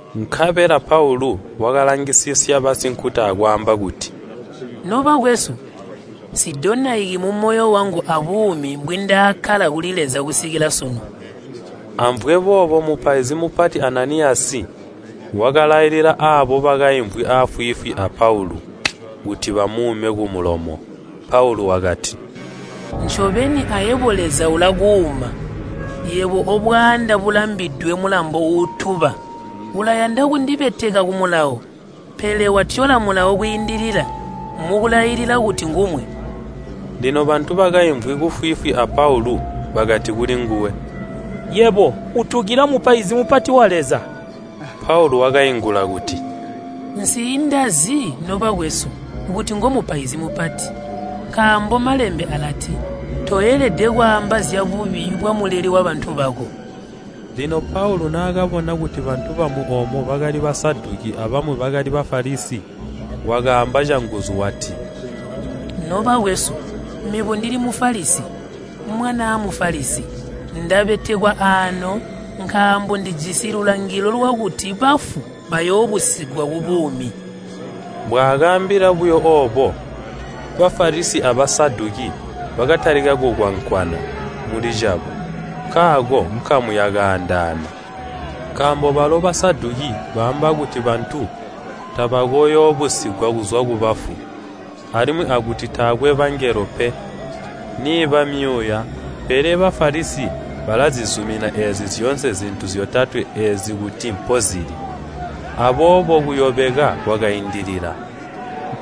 Nkabela Paulu wakalangisisya basinkuta akwaamba kuti, “Nobakwesu, nsidonaiki mumoyo wangu abuumi mbwiindakkala kuli Leza kusikila sunu.” Amvwe boobo mupaizi mupati Ananiyasi wakalailila aabo bakaimvwi aafwiifwi a Paulu kuti bamuume kumulomo. Paulu wakati, “Ncobeni ayebo Leza ulakuuma, yebo obwaanda bulambidwe mulambo uutuba! Ulayanda kundibeteka ku Mulawo, pele watyola Mulawo kwiindilila mukulailila kuti ngumwe!” Lino bantu bakaimvwi kufwiifwi a Paulu bakati kulingwe, “Yebo, utukila mupaizi mupati wa Leza!” Paulu wakaingula kuti, “Nsiindazi, nobakwesu, kuti ngomupaizi mupati. Nkaambo Malembe alati, ‘Toelede kwaamba zyabubi bwamuleli wabantu bako.’” Lino Paulu naakabona kuti bantu bamwi oomo bakali Basaduki abamwi bakali Bafalisi, wakaamba canguzu wati, “Nobakwesu, mebo ndili Mufalisi, mwanaa Mufalisi. Ndabetekwa aano nkaambo ndijisi lulangilo lwakuti bafu bayoobusigwa kubuumi!” Mbwaakaambila buyo oobo, Bafalisi a Basaduki bakatalika kukwankwana mulicabo, nkaako nkamu yakaandaana. (Nkaambo balo Basaduki baamba kuti bantu tabakooyoobusigwa kuzwa kubafu, alimwi akuti taakwe bangelo pe, niiba myuuya, pele Bafalisi balazizumina eezi zyoonse zintu zyotatwe eezi kuti mpozili.) Aboobo kuyobeka kwakaindilila.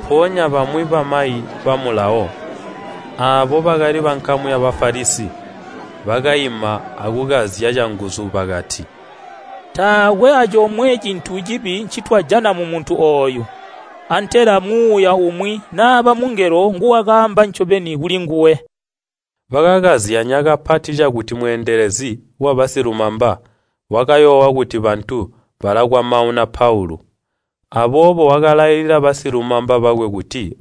Mpoonya bamwi bamayi ba Mulawo, aabo bakali bankamu ya Bafalisi, bakaima akukazya canguzu bakati, “Taakwe acomwe cintu cibi ncitwajana mumuntu ooyu! Antela muuya umwi naba mungelo nguwakaamba ncobeni kulinguwe!” Bakakazyanya kapati cakuti mweendelezi wabasilumamba wakayoowa kuti bantu balakwamauna Paulu, aboobo wakalailila basilumamba bakwe kuti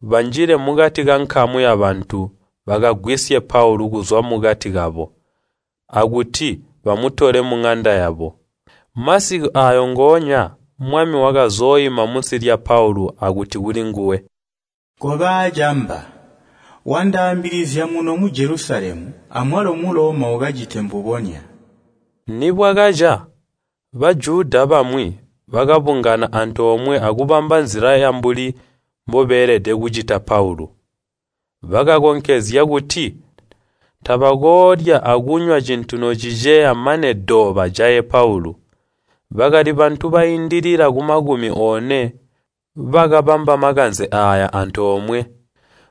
banjile mukati kankamu yabantu bakagwisye Paulu kuzwa mukati kabo, akuti bamutole muŋanda yabo. Masiku aayo ngoonya Mwami wakazooima munsi lya Paulu akuti kulinguwe, “Koba aacamba! Wandaambilizya muno mu Jelusalemu amwalo mu Loma ukacite mbubonya.” Nibwakaca, Bajuda bamwi bakabungana antoomwe akubamba nzila yambuli mbobeelede kucita Paulu. Bakakonkezya kuti tabakoolya akunywa cintu nociceya mane do bajaye Paulu. Bakali bantu baindilila kumakumi one bakabamba makanze aaya antoomwe.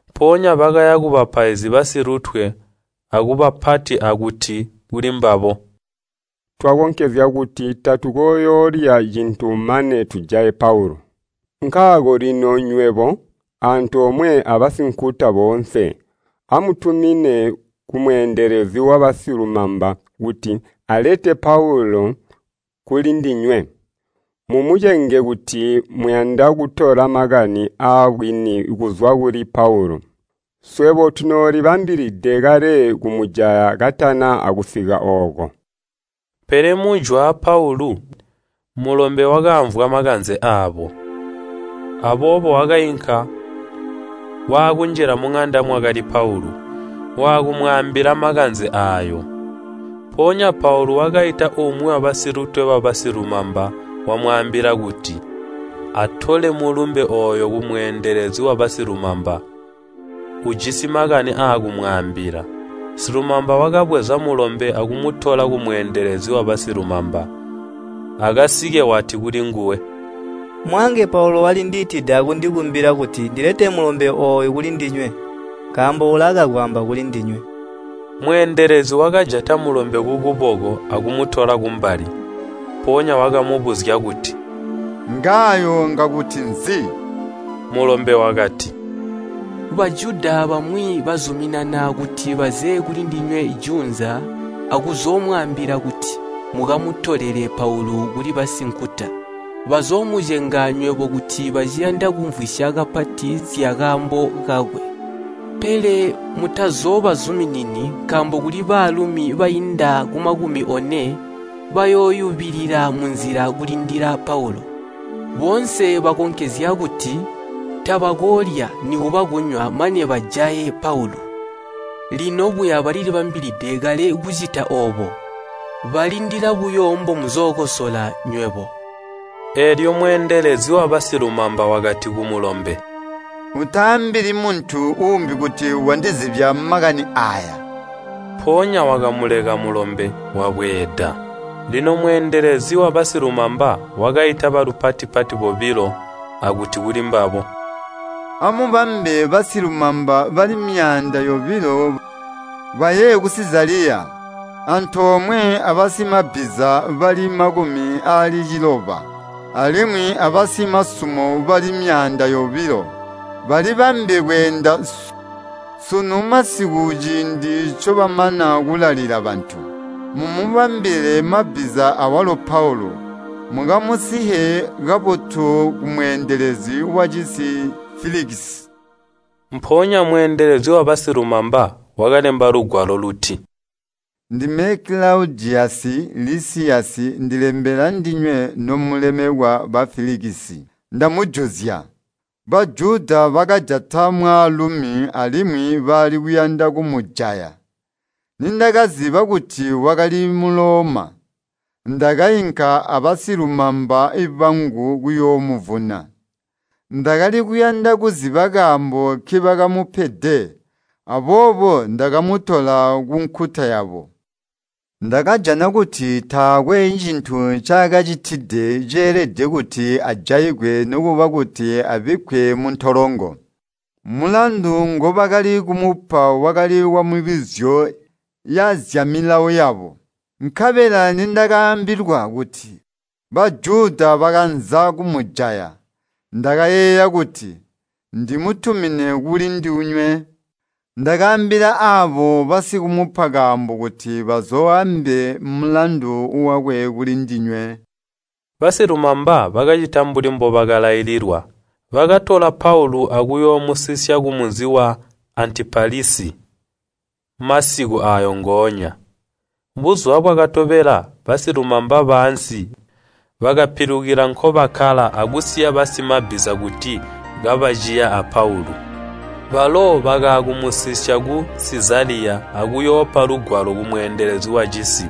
Mpoonya bakaya kubapaizi basilutwe akubapati akuti kulimbabo, “Twakonkezya kuti tatukooyoolya cintu mane tujaye Paulu. Nkaako lino nywebo, antoomwe abasinkuta boonse, amutumine kumweendelezi wabasilumamba kuti alete Paulu kulindinywe, mumucenge kuti muyanda kutola makani aabwini kuzwa kuli Paulu. Swebo tunoolibambide kale kumujaya katana akusika ooko.” Pele mujwaa Paulu, mulombe wakaamvwa makanze aabo, aboobo wakainka waakunjila muŋanda mwakali Paulu, waakumwaambila makanze aayo. Mpoonya Paulu wakaita umwi wabasilumamba, wamwaambila kuti, “Atole mulumbe ooyo kumweendelezi wabasilumamba. Ujisi makani aakumwaambila.” Silumamba wakabweza mulombe akumutola kumweendelezi wabasilumamba. Akasike wati kulinguwe, “Mwaange Paulu walindiitide akundikumbila kuti ndilete mulombe ooyu kulindinywe nkaambo ulaakakwaamba kulindinywe.” Mweendelezi wakajata mulombe kukuboko akumutola kumbali, mpoonya wakamubuzya kuti, “Ngaayo ngakuti nzi?” Mulombe wakati, “Bajuda bamwi bazuminana kuti baze kulindinywe juunza akuzoomwaambila kuti mukamutolelele Paulu kuli basinkuta. Bazoomucenga nywebo kuti baciyanda kumvwisya kapati zyakaambo kakwe. Pele mutazoobazuminini, nkaambo kuli baalumi bainda kumakumi one bayooyubilila munzila kulindila Paulu. Boonse bakonkezya kuti tabakoolya nikuba kunywa mane bajaye Paulu. Lino buya balilibambilide kale kucita oobo, balindila buyo mbomuzookosola nywebo.” Eelyo mweendelezi wabasilumamba wakati kumulombe, “Utaambili muntu uumbi kuti wandizibya makani aaya.” Mpoonya wakamuleka mulombe, wabweeda. Lino mweendelezi wabasilumamba wakaita balupati-pati bobilo akuti kulimbabo, “Amubambe basilumamba bali myaanda yobilo baye ku Sizaliya, antoomwe abasimabbiza bali makumi aali ciloba, alimwi abasimasumo bali myaanda yobilo, balibambe kweenda sunu masiku ciindi ncobamana kulalila bantu. Mumubambile mabbiza awalo Paulu, mukamusiye kabotu kumweendelezi wacisi Filikisi.” Mpoonya mweendelezi wabasilumamba wakalemba lugwalo luti: “Ndime Kilaudiyasi Lisiyasi ndilembela ndinywe nomulemekwa ba Filikisi. Ndamujuzya. Bajuda bakajata mwaalumi alimwi bali kuyanda kumujaya. Nindakaziba kuti wakali Muloma, ndakainka abasilumamba bangu kuyoomuvuna. Ndakali kuyanda kuziba kaambo nkibakamupede, aboobo ndakamutola kunkuta yabo. Ndakajana kuti taakwe cintu ncaakacitide ceelede kuti ajaigwe nikuba kuti abikkwe muntolongo, mulandu ngobakali kumupa wakali wamibuzyo yazyamilawo yabo. Nkabela nindakaambilwa kuti Bajuda bakanza kumujaya, ndakayeeya kuti ndimutumine kulindinywe. Ndakaambila aabo basikumupa kaambo kuti bazooambe mulandu wakwe kulindinywe.” Basilumamba bakacita mbuli mbobakalaililwa. Bakatola Paulu akuyoomusisya kumunzi wa Antipatilisi masiku aayo ngoonya. Buzuba bwakatobela basilumamba baansi bakapilukila nkobakkala akusiya basimabbiza kuti kabaciya a Paulu. Balo bakaakumusisya ku Sizaliya akuyoopa lugwalo kumweendelezi wacisi,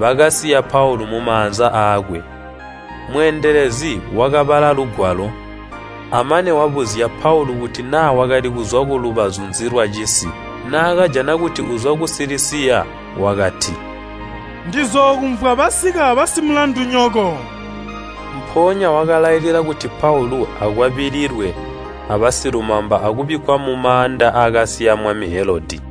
bakasiya Paulu mumaanza aakwe. Mweendelezi wakabala lugwalo, amane wabuzya Paulu kuti naa wakali kuzwa kulubazu nzi lwacisi. Naakajana kuti uzwa ku Silisiya wakati, “Ndizookumvwa basika basimulandunyoko.” Mpoonya wakalailila kuti Paulu akwabililwe abasilumamba akubikkwa mumaanda aakasiya mwami Helodi.